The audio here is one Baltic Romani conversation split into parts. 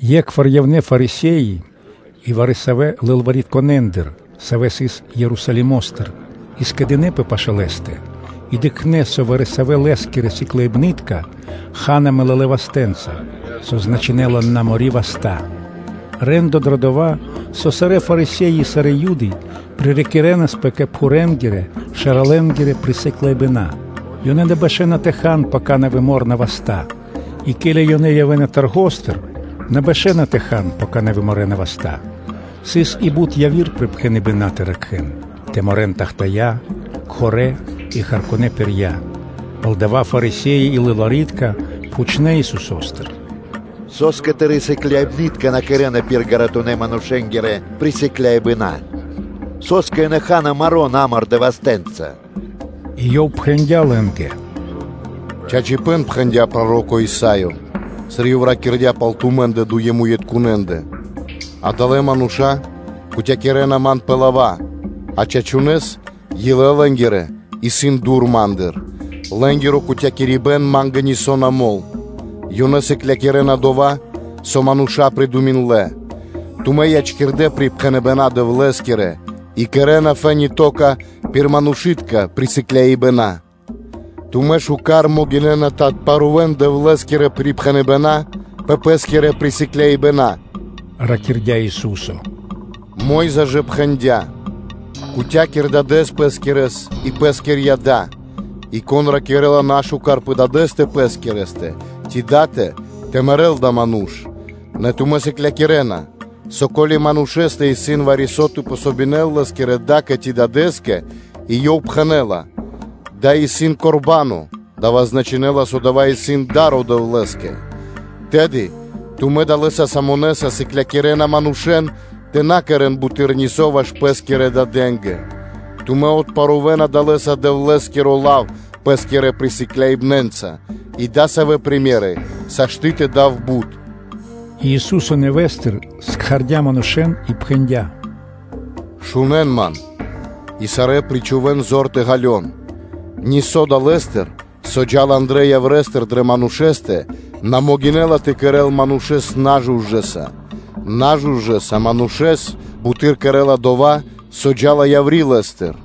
Екхвар явнэ́ Фарисе́и и вари-савэ́ лылваритконэндыр, савэ́ явнэ́ Ерусалимо́стыр, и скэдынэ́пэ пашы́л Лэ́стэ. И дыкхнэ́, со вари-савэ́ Лэ́скирэ сыкляибны́тка ха́на “мэлалэ вастэ́нца”, со значынэ́ла, “на мо́ри васта́.” Рэ́ндо (де́ло) дро дова́, со сарэ́ Фарисе́и и сарэ́ Юды пририкирэнпэ кэ пхурэнгирэ-шэралэнгирэ присыкляибэна: ёнэ на бэшэна тэ хан, пака на выморна васта́, и ке́ли ёнэ явэ́на таргостыр, ёнэ на бэшэна тэ хан, пака на выморэна васта́; сыс и бут яви́р припхэныбэна́ тэ ракхэ́н: тэ морэн тахтая́ (чашы), мусэра (стаканы) и харкунэ́ (меди́тка) пирья; палдова́ Фарисе́и и лылвари́тка пхучнэ́ Исусо́стыр: “Со́скэ Тырэ́ сыкляибны́тка на кэрэ́на пир ґаратунэ́-манушэ́нгирэ присыкляибэна? Со́скэ ёнэ ха́на маро́ намордэ вастэ́нца?” И Ёв пхэндя́ лэ́нгэ: “Чачипэ́н пхэндя́ проро́ко Исаё, сыр ёв ракирдя́ пал тумэ́ндэ, дуемуитконэндэ: ‘Адалэ́ мануша́ кутякирэна ман пэ лава́, а чачунэ́с илэ лэ́нгирэ исын дур Ма́ндыр; лэ́нгиро кутякирибэн Ма́нгэ нисо́ на мол. Ёнэ сыклякирэ́на дова́, со мануша́ придуминдлэ.’” Тумэ́ ячкирдэ́ припхэныбэна́ Дэвлэ́скирэ и кэрэ́на фэ́ни (то́ка) пир манушы́тка присыкляибэна. Тумэ́ шука́р могинэ́на тэ отпарувэн Дэвлэ́скирэ припхэныбэна́ пэ пэ́скирэ присыкляибэна”, – ракирдя́ Ису́со. Мо́йза ж пхэндя́: “Кутякир дадэ́с пэ́скирэс и пэскирья́ да”, и, “Кон ракирэ́ла нашукар пэ дадэ́стэ пэскирэстэ ци датэ, тэ мэрэ́л адава́ ману́ш. Нэ тумэ́ сыклякирэ́на, со ко́ли манушэ́стэ исын вари-со тэ помогинэл лэ́скирэ да́кэ ци дадэ́скэ и ёв пхэнэ́ла: ‘Дава́ исын Корбано (дава́ значынэ́ла, со дава́ исын да́ро Дэвлэ́скэ)’, тэды тумэ́ далэ́са самонэса сыклякирэ́на манушэ́н тэ на кэрэ́н буты́р нисо́ ваш пэ́скирэ дадэ́нгэ, тумэ́ отпарувэна далэ́са Дэвлэ́скиро лав пэ́скирэ присыкляибнэнца, и дасавэ́ примеры (сыкаибэна) сашты́ тэ явэ́н тэ дав бут.” И Ису́со нэвэ́стыр кхардя́ кэ Пэ манушэ́н и пхэндя́: “Шунэ́н Ман и сарэ́ причхувэ́н зор тэ ґалён: Нисо́ далэ́стыр, со джа́ла андрэ́ яврэстыр дрэ манушэ́стэ, на могинэ́ла тэ кэрэ́л манушэ́с нажужэса; нажужэса манушэ́с бутэды́р кэрэ́ла дова́, со джа́ла яври́ лэ́стыр.”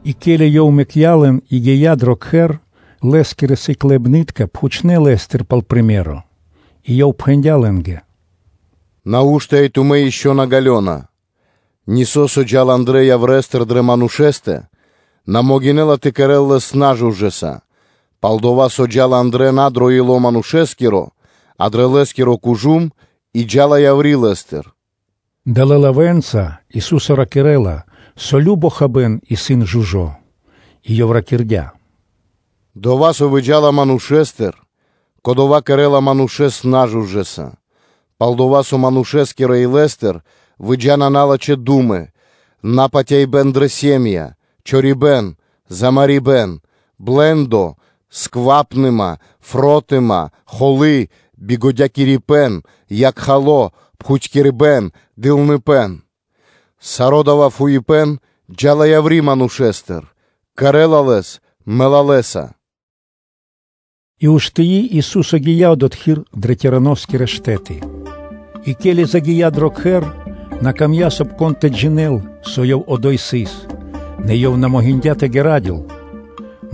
И ке́ли Ёв мэкця́ лэн и гия́ дро кхэр, Лэ́скирэ сыкляибны́тка пхучнэ́ Лэ́стыр пал приме́ро (сыкаибэ́н). И Ёв пхэндя́ лэ́нгэ: “Нау́што и тумэ́ ишчо (инкэ́) на ґалёна? Нисо́, со джа́ла андрэ́ яврестыр дрэ манушэ́стэ, на могинэ́ла тэ кэрэ́л лэс нажужэса, пал-дова́ со, дава́ джа́ла андрэ́ на дро ило́ Манушэ́скиро, а дрэ лэ́скиро кужум и джа́ла яври́ лэ́стыр.” (Далэ́ лавэ́нца Ису́со ракирэ́ла, со кажно хабэ́н исын жужо́). И Ёв ракирдя́: “Дова́, со выджа́ла манушэ́стыр, кодова́ кэрэ́ла манушэ́с нажужэса; пал-дова́ со манушэ́скирэ илэ́стыр выджа́на налачхэ́ ду́мы, напатяибэн дрэ сэ́м΄я (ири́), чорибэн, замарибэн, блэ́ндо, сквапныма, фротыма, холы́, ладжавэ рэ́нды, якхало, пхутькирибэ́н, дылныпэ́н. Саро́ дава́ фуипэ́н джа́ла яври́ манушэ́стыр, и кэрэ́ла лэс мэлалэса.” И уштыи, Ису́со гия́ одотхы́р дрэ Тироноскирэ штэ́ты. И ке́ли загия́ Ёв дро кхэр, Ёв на мыслйндя дро ило́, соб (кай) вари-кон тэ джинэ́л, со Ёв одо́й сыс; нэ Ёв на могиндя́ тэ ґарадёл.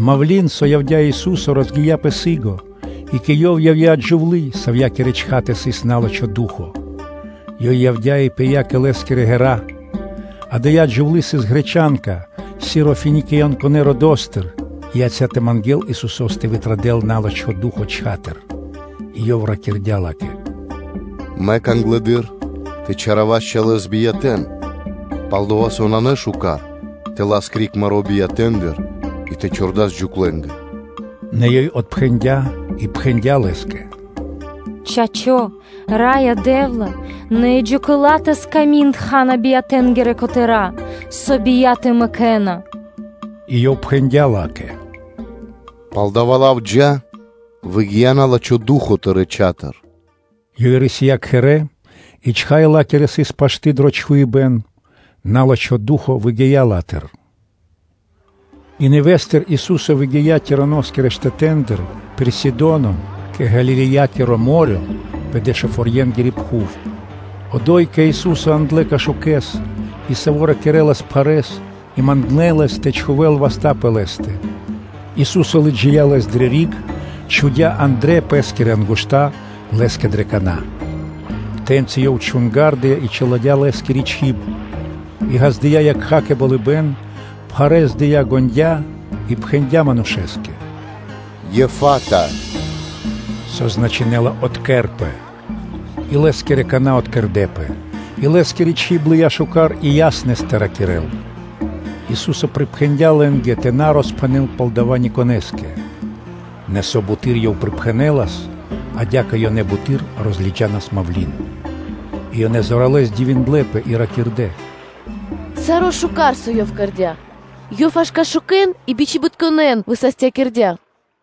Мавлы́н (малва), со явдя́ Ису́со, розгия́пэ сы́гэс, и кэ Ёв явдя́ джувлы́, савьякирэ чхатэ сыс на́лачхо ду́хо (фа́но). Ёй явдя́ и пыя́ кэ Лэ́скирэ ґэра́; ада́я джувлы́ сыс гречанка (баламица) Сирофиниянкакирэ родо́стыр и яця́ тэ мангэ́л Исусо́с тэ вытрадэл на́лачхо ду́хо (фа́но) чхатыр. И Ёв ракирдя́ ла́кэ: “Мэк англэды́р тэ чалякирэн чалэ́с биятэ́н, пал-дова́ со на шука́р тэ лас криг маро́ биятэндыр и тэ чхурдас джуклэнгэ.” Нэ ёй отпхэндя́ и пхэндя́ Лэ́скэ: “Чачо́, Раё Дэ́вла, нэ и джукэла тэл сками́нд ха́на биятэнгирэ котэра́, со бияты мэкэ́на.” И Ёв пхэндя́ ла́кэ: “Пал дава́ лав, джа́; выгия́ на́лачхо ду́хо (фа́но) тырэ́ чхатыр.” Ёй рисия́ кхэрэ́, и чхай ла́кири сыс пашты дро чхуибэ́н, на́лачхо ду́хо (фа́но) выгия́ ла́тыр. И нэвэ́стыр Ису́со выгия́ Тироноскирэ штэтэ́ндыр пирда́л Сидоно кэ Галилеякиро мо́рё (дэрья́в) пэ Дэшуфорьенгири пхув. Одо́й кэ Ису́со яндлэ́ кашукэс и, саво́ ракирэ́лас пхарэ́с и мангнэ́ Лэс тэ чхувэ́л васта́ пэ лэ́стэ. Ису́со лыджия́ лэс дрэ риг, чхудя́ андрэ́ пэ́скирэ ангушта (пальцы) лэ́скэ дрэ кана́. Тэ́ньци Ёв чунгардыя и чиладя́ лэ́скири чиб, и ґаздыя́ ёв якха́ кэ болыбэ́н, пхарэ́с дыя́ ґондя́ (дыкхниндя дрэ пэ́стэ) и пхэндя́ манушэ́скэ: “Еффата!” (Со значынэ́ла: “Откэрпэ”). И лэ́скирэ кана́ откэрдэпэ, и лэ́скири чиб лыя́ шука́р и яснэс тэ ракирэ́л. Ису́со припхэндя́ лэ́нгэ тэ на роспхэнэ́н пал дава́ никонэ́скэ. Нэ, со буты́р Ёв припхэнэлас, адя́кэ ёнэ буты́р розлыджанас мавлы́н. И ёнэ зоралэ́с дивиндлэ́пэ и ракирдэ́: “Саро́ шука́р, со Ёв кэрдя́, Ёв аж кашукэн и бичибитконэн высастякирдя́.”